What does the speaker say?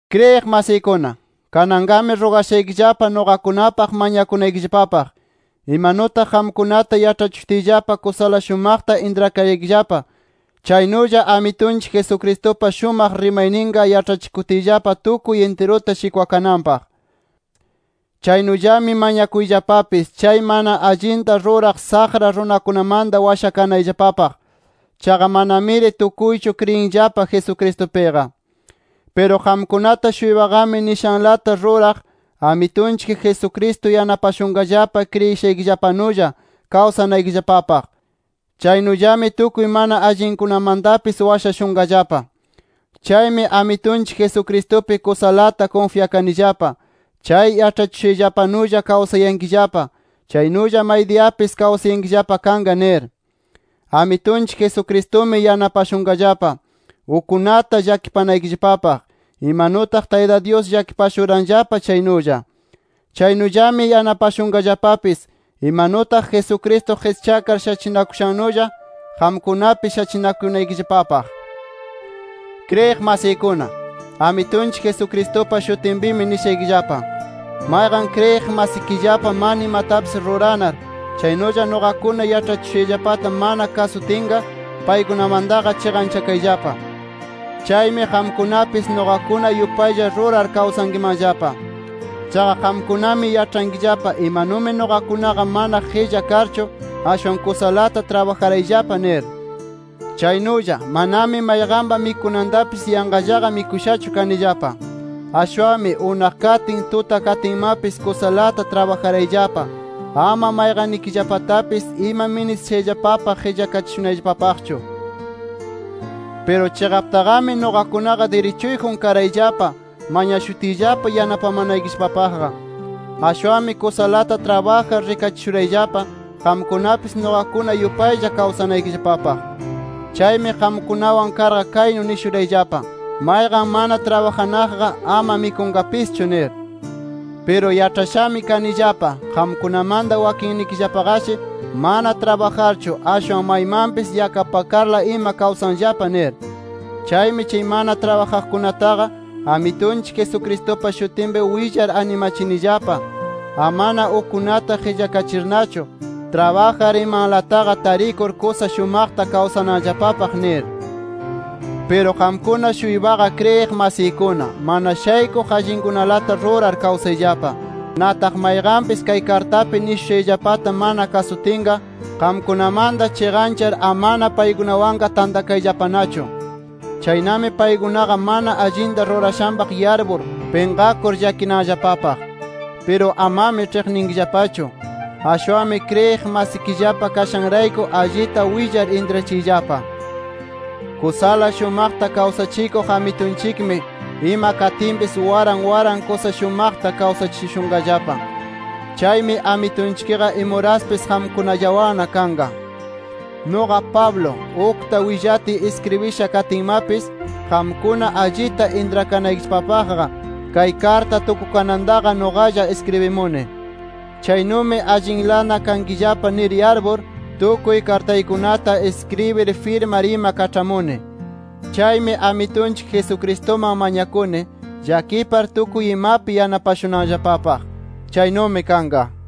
Kriyiq masiykuna, kananqami rugashaykillapa nuqakunapaq mañakunaykillapapaq, imanutaq qamkunata yaĉhachishutiyllapa kusala shumaqta intrakaraykillapa, chaynulla Amitunchik Jesucristupa shumaq rimayninqa yaĉhachikutiyllapa tukuy intirunta shikwakananpaq. Chaynullami mañakuyllapapis chay mana allinta ruraq saqra runakunamanta washakanayllapapaq. Chaqa manamiri tukuychu kriyinllapa Jesucristupiqa. Piru qamkunata-shuypaqami nishanlata ruraq, Amitunchik Jesucristo yanapashunqallapa kriyishaykillapanulla kawsanaykillapapaq. Chaynullami tukuy mana allinkunamantapis washashunqallapa. Chaymi Amitunchik Jesucristupi kusalata kunfyakanillapa, chay yaĉhachishushayllapanulla kawsayankillapa, chaynulla maydiyapis kawsayankillapa kanqa nir. Amitunchik Jesucristumi yanapashunqallapa, ukkunata llakipanaykillapapaq, imanutaq Tayta Dyus llakipashuranllapa chaynulla. Chaynullami yanapashunqallapapis imanutaq Jesucristo qischakar shachinakushannulla qamkunapis shachinakunaykillapapaq. Kriyiq masiykuna, Amitunchik Jesucristupa shutinpimi nishaykillapa: Mayqan kriyiq masikillapa mana imatapis ruranar, chaynulla nuqakuna yaĉhachishushayllapata mana kasutinqa, paykunamantaqa chiqanchakayllapa. Chaymi qamkunapis nuqakuna yupaylla rurar kawsankimanllapa. Chaqa qamkunami yaĉhankillapa imanumi nuqakunaqa mana qilla karchu, ashwan kusalata trabajarayllapa nir. Chaynulla, manami mayqanpa mikunantapis yanqallaqa mikushachu kanillapa. Ashwanmi, unaq katin, tuta katinmapis kusalata trabajarayllapa, ama mayqannikillapatapis ima ministishayllapapaq qillakachishunayllapapaqchu. Piru chiqaptaqami nuqakunaqa dirichuyjun karayllapa, mañashutiyllapa yanapamanaykillapapaqqa. Ashwanmi kusalata trabajar rikachishurayllapa, qamkunapis nuqakuna yupaylla kawsanaykillapapaq. Chaymi qamkunawan karqa kaynu nishurayllapa: “Mayqan mana trabajanaqqa, ama mikunqapischu” nir. Piru yaĉhashami kanillapa qamkunamanta wakinnikillapaqashi mana trabajarchu, ashwan maymanpis yakapakarla ima kawsanllapa nir. Chaymi chay mana trabajanaqkunataqa Amitunchik Jesucristupa shutinpi willar animachinillapa, amana ukkunata qillakachirnachu, trabajar imalantaqa tarikur kusa shumaqta kawsananllapapaq nir. Piru qamkuna-shuypaqa kriyiq masiykuna, mana shaykuq allinkunalata rurar kawsayllapa. Nataq mayqanpis kay kartapi nishushayllapata mana kasutinqa, qamkunamanta chiqanchar, amana paykunawanqa tantakayllapanachu. Chaynami paykunaqa mana allinta rurashanpaq yarpur, pinqakur llakinanllapapaq. Piru amami ĉhiqninkillapachu. Ashwanmi kriyiq masikillapa kashanrayku allita willar intrachiyllapa. Kusala shumaqta kawsachikuq Amitunchikmi ima katinpis waran waran kusa shumaqta kawsachishunqallapa. Chaymi Amitunchikqa imuraspis qamkunallawanna kanqa. Nuqa Pablo, ukta willatiy iskribisha katinmapis, qamkuna allita intrakanaykillapapaqqa kay karta tukukanantaqa nuqalla iskribimuni. Chaynumi allinla kankillapa nir yarpur, tukuy kartaykunata iskribir, firmar ima kaĉhamuni. Chaymi Amitunchik Jesucristuman mañakuni, llakipar tukuy imapi yanapashunanllapapaq. Chaynumi kanqa.